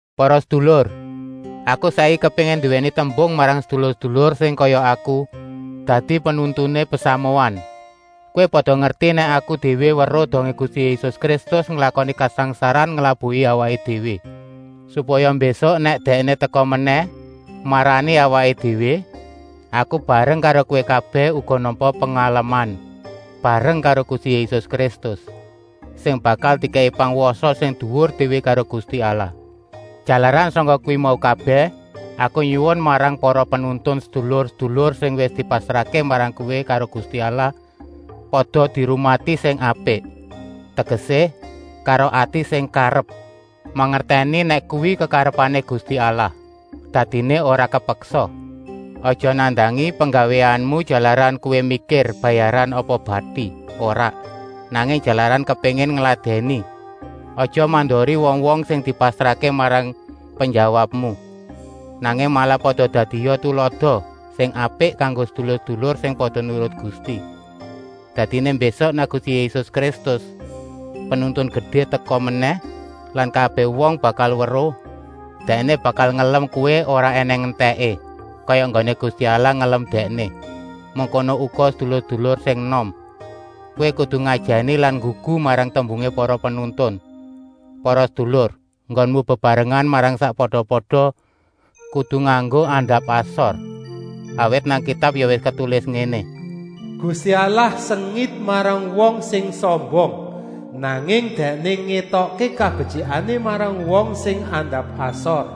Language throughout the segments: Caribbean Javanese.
Para sedulur, aku saiki kepéngin nduwèni tembung marang sedulur-sedulur sing kaya aku dadi penuntuné pasamuan. Kowé pada ngerti nèk aku déwé weruh dongé Gusti Yésus Kristus nglakoni kasangsaran nglabuhi awaké déwé, supaya mbésuk nèk Dèkné teka menèh marani awaké déwé, aku bareng karo kowé kabèh uga nampa pengaleman bareng karo Gusti Yésus Kristus, sing bakal dikèki pangwasa sing duwur déwé karo Gusti Allah. Jalaran sangka kuwi mau kabèh, aku nyuwun marang para penuntun, sedulur-sedulur sing wis dipasrahké marang kowé karo Gusti Allah pada dirumati sing apik, tegesé, karo ati sing karep, mangertèni nèk kuwi kekarepané Gusti Allah, dadiné ora kepeksa. Aja nandangi penggawéanmu jalaran kowé mikir bayaran apa bati, ora, nanging jalaran kepéngin ngladèni. Aja mandori wong-wong sing dipasrahké marang penjawabmu, nanging malah pada dadia tulada sing apik kanggo sedulur-sedulur sing pada nurut Gusti. Dadiné mbésuk, nèk Gusti Yésus Kristus, Penuntun Gedé, teka menèh lan kabèh wong bakal weruh, Dèkné bakal ngelem kowé ora ènèng entèké, kaya enggoné Gusti Allah ngelem Dèkné. Mengkono uga sedulur-sedulur sing enom. Kowé kudu ngajèni lan nggugu marang tembungé para penuntun. Para sedulur, enggonmu bebarengan marang sakpada-pada kudu nganggo andap-asor. Awit nang Kitab ya wis ketulis ngéné: “Gusti Allah sengit marang wong sing sombong, nanging Dèkné ngétokké kabetyikané marang wong sing andap-asor.”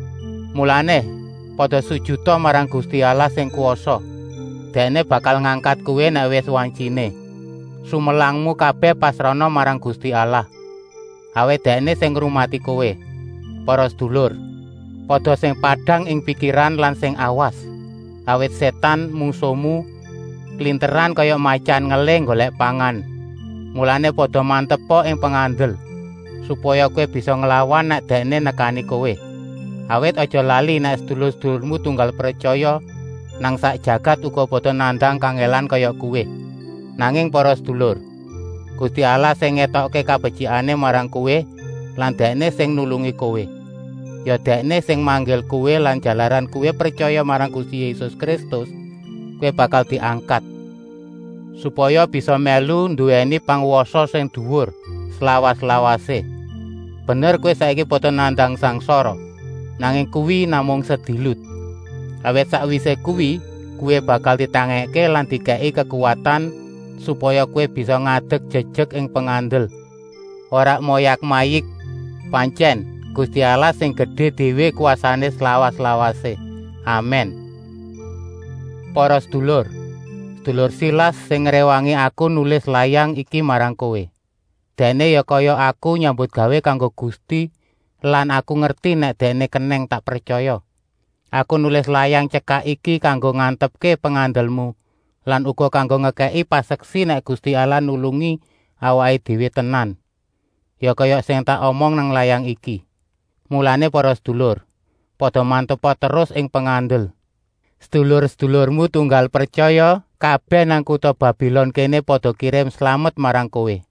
Mulané, pada sujuta marang Gusti Allah sing kwasa, Dèkné bakal ngangkat kowé nèk wis wantyiné. Sumelangmu kabèh pasrahna marang Gusti Allah, awit Dèkné sing ngrumati kowé. Para sedulur, pada sing padang ing pikiran lan sing awas, awit Sétan, mungsuhmu, klinteran kaya matyan ngelih nggolèk pangan. Mulané, pada mantepa ing pengandel, supaya kowé bisa nglawan nèk dèkné nekani kowé. Awit, aja lali nèk sedulur-sedulurmu tunggal pretyaya nang sak jagat uga pada nandang kangèlan kaya kowé. Nanging para sedulur, Gusti Allah sing ngétokké kabetyikané marang kowé lan Dèkné sing nulungi kowé, ya Dèkné sing manggil kowé lan jalaran kowé pretyaya marang Gusti Yésus Kristus, kowé bakal diangkat, supaya bisa mèlu nduwèni pangwasa sing duwur, slawas-lawasé. Bener kowé saiki pada nandang sangsara, nanging kuwi namung sedilut. Awit sakwisé kuwi kowé bakal ditangèkké lan dikèki kekuwatan, supaya kowé bisa ngadek jejek ing pengandel, ora moyak-mayik. Pantyèn, Gusti Allah sing gedé déwé kwasané slawas-lawasé. Amèn. Para sedulur, sedulur Silas sing ngréwangi aku nulis layang iki marang kowé. Dèkné ya kaya aku nyambutgawé kanggo Gusti lan aku ngerti nèk dèkné kenèng tak pretyaya. Aku nulis layang tyekak iki kanggo ngantepké pengandelmu lan uga kanggo ngekèki paseksi nèk Gusti Allah nulungi awaké déwé tenan, ya kaya sing tak omong nang layang iki. Mulané para sedulur, pada mantepa terus ing pengandel. Sedulur-sedulurmu tunggal pretyaya kabèh nang kuta Babilon kéné pada kirim slamet marang kowé.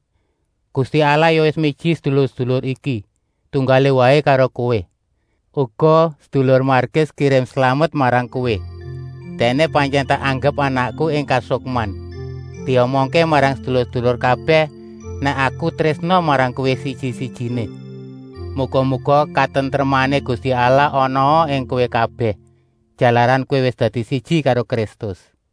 Gusti Allah ya wis miji sedulur-sedulur iki, tunggalé waé karo kowé. Uga sedulur Markus kirim slamet marang kowé. Dèkné pantyèn tak anggep anakku ing kasukman. Diomongké marang sedulur-sedulur kabèh nèk aku trésna marang kowé siji-sijiné. Muga-muga katentremané Gusti Allah anaa ing kowé kabèh, jalaran kowé wis dadi siji karo Kristus. Pétrus